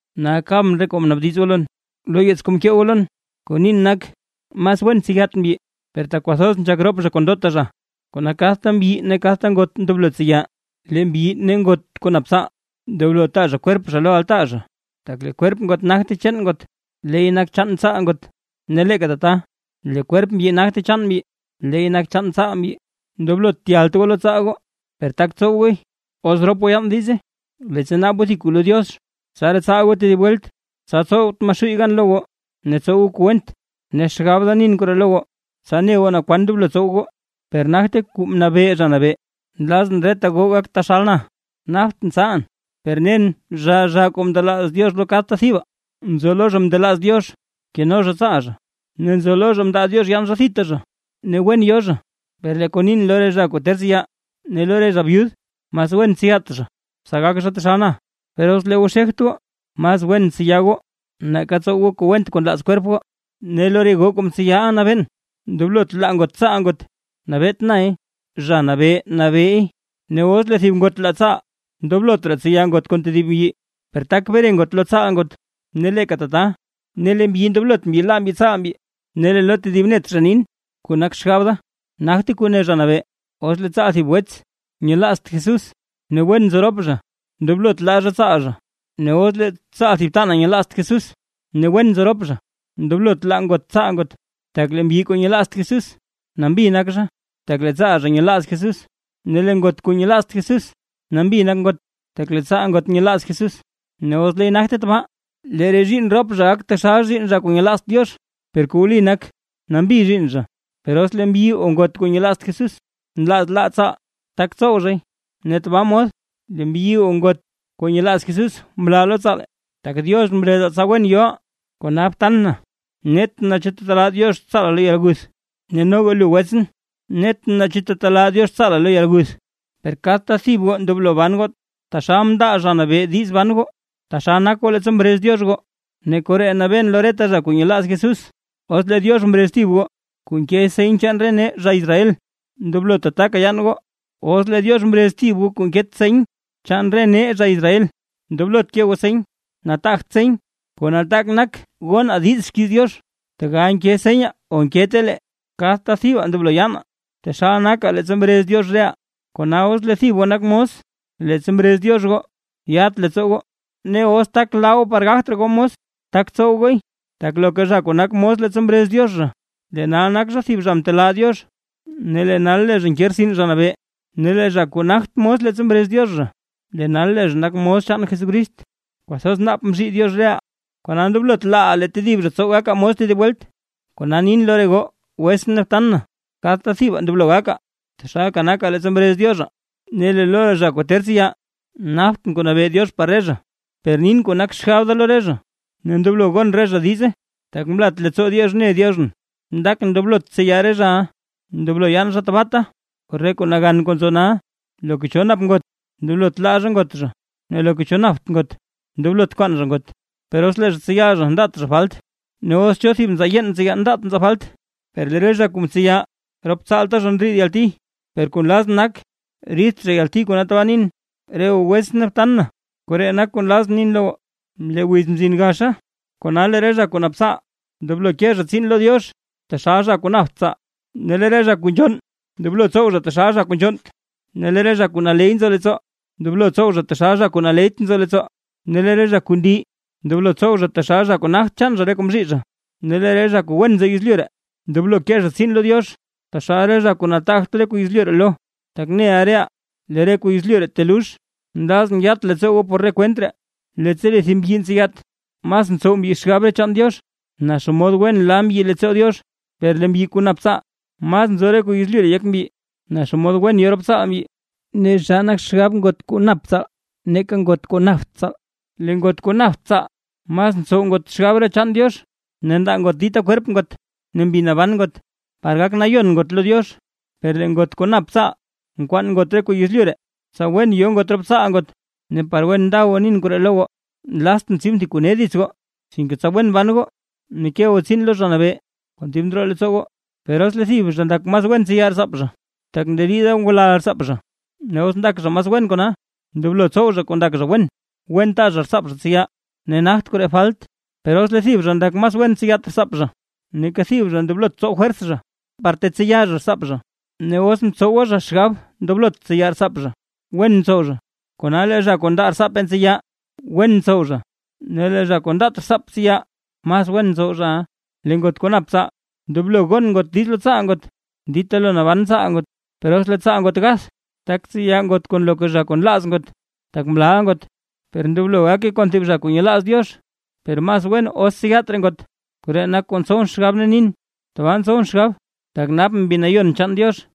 Nal kabʼn re kuu mnaabdiz goo lon, lo yeets kuu mkee goo lon. Kuu nin nak: Mas wen tseyat mbyi; per tak kwathoz nzhak rop zha kon ndota zha, kona kadta mbyi ne kadta ngot ndoblo tseya. Lee mbyi ne ngot kuu nap tsaal, ndoblo taa zha kwerp zha lo altaa zha. Tak lee kwerp ngot nagte chaan ngot, leey nak chaan tsaal ngot. Ne leeka tata lee kwerp mbyi nagte chaan mbyi, leey nak chaan tsaal mbyi. Ndoblot tyalt goo lo tsaal goo. Per tak tsow gooy, os rop goo yaan diize, leettsa naab goo thib kuu lo Diox. Ne tsaraa tsaal goo tedib welt, tsa tsowt Maxuuy gan lo goo ne tsow goo kuu went. Ne xgab da nin koree lo goo, tsa ne goo naa kwan ndoblo tsow goo, per nagte kuu mnabee Zha Nabee. Nlazʼn reta goo gak taxal na, naptʼn tsaalʼn. Per nen zhaa zhaa kuu ndelaaz Diox lo kadta thibaa, nzo lo zha mndelaaz Diox keno zha tsaal zha, ne nzo lo zha mndelaaz Diox yaan zha thita zha ne wen yo zha. Per kuu nin lo re zha kuu ter tseya ne lo re zha byud, mas wen tseyat zha, tsa gak zha taxal na. Per os lee goo xegt goo, mas wen btseya goo, nake tsow goo kuu went kuu nlaaz kwerp goo. Ne lo re goo kuu mtseyaʼa nabeen, ndoblot laa ngot tsaal ngot, nabeet nay Zha Nabee nabeey. Ne os lee thib ngot laa tsaal, ndoblot raa tseya ngot kon tedib mbyi, per tak bre ngot lo tsaal ngot. Ne leeka tata, ne lee mbyi ndoblot mbyi laa mbyi tsaal mbyi. Lee lo tedib net zha nin, kuu nak xgab da, nagte kuu ne Zha Nabee: Os lee tsaal thib wets nyelaazt Jesús ne wen nzo rop zha, ndoblot laa zha tsaal zha. Ne os lee tsaal thib btanaa nyelaazt Jesús, ne wen nzo rop zha, ndoblot laa ngot tsaal ngot. Tak lee mbyi kuu nyelaazt Jesús, nambi nak zha, tak lee tsaal zha nyelaaz Jesús, ne lee ngot kuu nyelaazt Jesús, nambi nak ngot, tak lee tsaal ngot nyelaaz Jesús. Ne os leey nagte tabaa lee re zhiinn rop zha gak taxal zhiinn zha kuu nyelaazt Diox, per kuu wli nak, nambi zhiinn zha. Per os lee mbyi o ngot kuu nyelaazt Jesús, nlaaz laa tsaal, tak tsow zhay. Ne tabaa mod lee mbyi o ngot kuu nyelaaz Jesús mlaa lo tsaal, tak Diox mrezaa tsa wen yoʼaa. Kona btan na, netʼn naa chu tetelaa Diox tsaala lo yalguth. Ne noga lu wetsʼn, netʼn naa chu tetelaa Diox tsaala lo yalguth. Per kadta thib goo ndoblo ban taxal mndaa Zha Nabee diiz ban goo, taxal nak goo leettsa mrez Diox goo. Ne koree nabeen lo reta zha kuu nyelaaz Jesús. Os lee Diox mrez thib goo kuu nke seny chaan re nee zha Israel, ndoblo tataka yaan goo; os lee Diox mrez thib goo kuu nket seny chaan re nee zha Israel, ndoblot ke goo seny. Nataagt seny, kuu nataak nak gonaa diiz xkiiz Diox, tegal nke senyaa o nkete lee. Kadta thibaa ndoblo yaanaa, taxal nakaa leettsa mrez Diox reʼaa. Kona os lee thib goo nak mos, leettsa mrez Diox goo, yat leettsoo goo, ne os tak laa goo par gagt raa goo mos, tak tsow gooy. Tak loka zha kuu nak mos leettsa mrez Diox zha, lee nal nak zha thib zha kuu mtelaa Diox, ne lee nal lee zha nke rtsin Zha Nabee; ne lee zha kuu nagt mos leettsa mrez Diox zha, lee nal lee zha nak mos chaan Jesucrist. Kwathoz naap mzhii Diox reʼaa, kona ndoblot laaʼaa lee tedib zha tsow gakaa mos tedib welt. Kona nin lo re goo wetsʼn ne btan na, kadta thibaa ndoblo gakaa taxalka nakaa leettsa mrez Diox reʼaa. Ne lo re zha kuu ter tseya, naptʼn kuu nabee Diox par re zha, per nin kuu nak xgab da lo re zha, ne ndoblo gon re zha diize, tak mlat leettsoo Diox mne Dioxʼn. Ndakʼn ndoblot tseya re zhaʼa, ndoblo yaan zha tabaata, por re kuu nagan kuu nzo nal. Loka cho nap ngot, ndoblot laa zha ngot zha; ne loka cho napt ngot, ndoblot kwaan zha ngot. Per os lee zha tseya zha ndaat zha falt, ne os cho thib nzaa yeen ntseya ndaat nzaa falt. Per lee re zha kuu ntseya rop tsaalta zha ndriid yalti, per kuu nlazʼn nak riidt zha yalti kona tabaa nin. Re goo wetsʼn ne btan na, koree nak kuu nlazʼn nin lo goo: Lee wiz mzin gaxa. Kona lee re zha kuu nap tsaal, ndoblo ke zha tsiin lo Diox taxal zha kuu napt tsaal; ne lee re zha kuu nzhonn ndoblo tsow zha taxal zha kuu nzhonnt, ne lee re zha kuu naley nzo leettsoo, ndoblo tsow zha taxal zha kuu naleyt nzo leettsoo, ne lee re zha kuu ndii ndoblo tsow zha taxal zha kuu nagt chaan zha re kuu mzhii. Ne lee re zha kuu wen nzo yezlyu ree, ndoblo ke zha tsiin lo Diox taxal zha kuu nataagt re kuu yezlyu ree lo, tak neʼa reʼaa lee re kuu yezlyu ree telux. Nlazʼn yat leettsoo goo por re kwent ree. Leettsa lee thib mbyi ntseyat, mas ntsow mbyi xgab re chaan Diox, naa xomod wen la mbyi leettsoo Diox; per lee mbyi kuu nap tsaal, mas nzo re kuu yezlyu ree yek mbyi, naa xomod wen yo rop tsaal zha. Ne zhaa nak xgab ngot kuu nap tsaal nake ngot kuu napt tsaal. Lee ngot kuu napt tsaal mas ntsow ngot xgab re chaan Diox, ne ndaa ngot dita kwerp ngot ne mbi naban ngot, par gak nayon ngot lo Diox. Per lee ngot kuu nap tsaal nkwaan ngot re kuu yezlyu ree, tsa wen yo ngot rop tsaal ngot. Ne par wen nda goo nin koree lo goo, nlaaztʼn tsibʼn thib kuu ne dits goo, sinke tsa wen ban goo ne ke goo tsiin lo Zha Nabee kon dib ndroo leettsoo goo. Per os lee thib zha ndak zha mas wen tseya rtsaap zha, tak nderiida ngulal rtsaap zha, os ndak zha mas wen kona, ndoblo tsow zha kuu ndak zha wen; wen taa zha rtsaap zha tseya, ne nagt koree falt. Per os lee tedib zha ndak zha mas wen tseyat rtsaap zha, neeka thib zha ndoblot tsow fwers zha, par tetseya zha rtsaap zha. Ne os mtsowa zha xgab ndoblot tseya rtsaap zha, wen ntsow zha. Kona lee zha kuu ndaa rtsaap tseya, wen ntsow zha; ne lee zha kuu ndaat rtsaap tseya, mas wen ntsow zhaʼa. Lee ngot kuu nap tsaal, ndoblo gon ngot diiz lo tsaal ngot, dita lo naban tsaal ngot; per os lee tsaal ngot gath, tak tseya ngot kon loka zha kuu nlaaz ngot, tak mlaaʼa ngot, per ndoblo gake kon thib zha kuu nyelaaz Diox. Per mas wen os tseyat raa ngot. Koree nak kuu ntsowʼn xgab ne nin, tabaa ntsowʼn xgab, tak napʼn Mbi Nayon chaan Diox.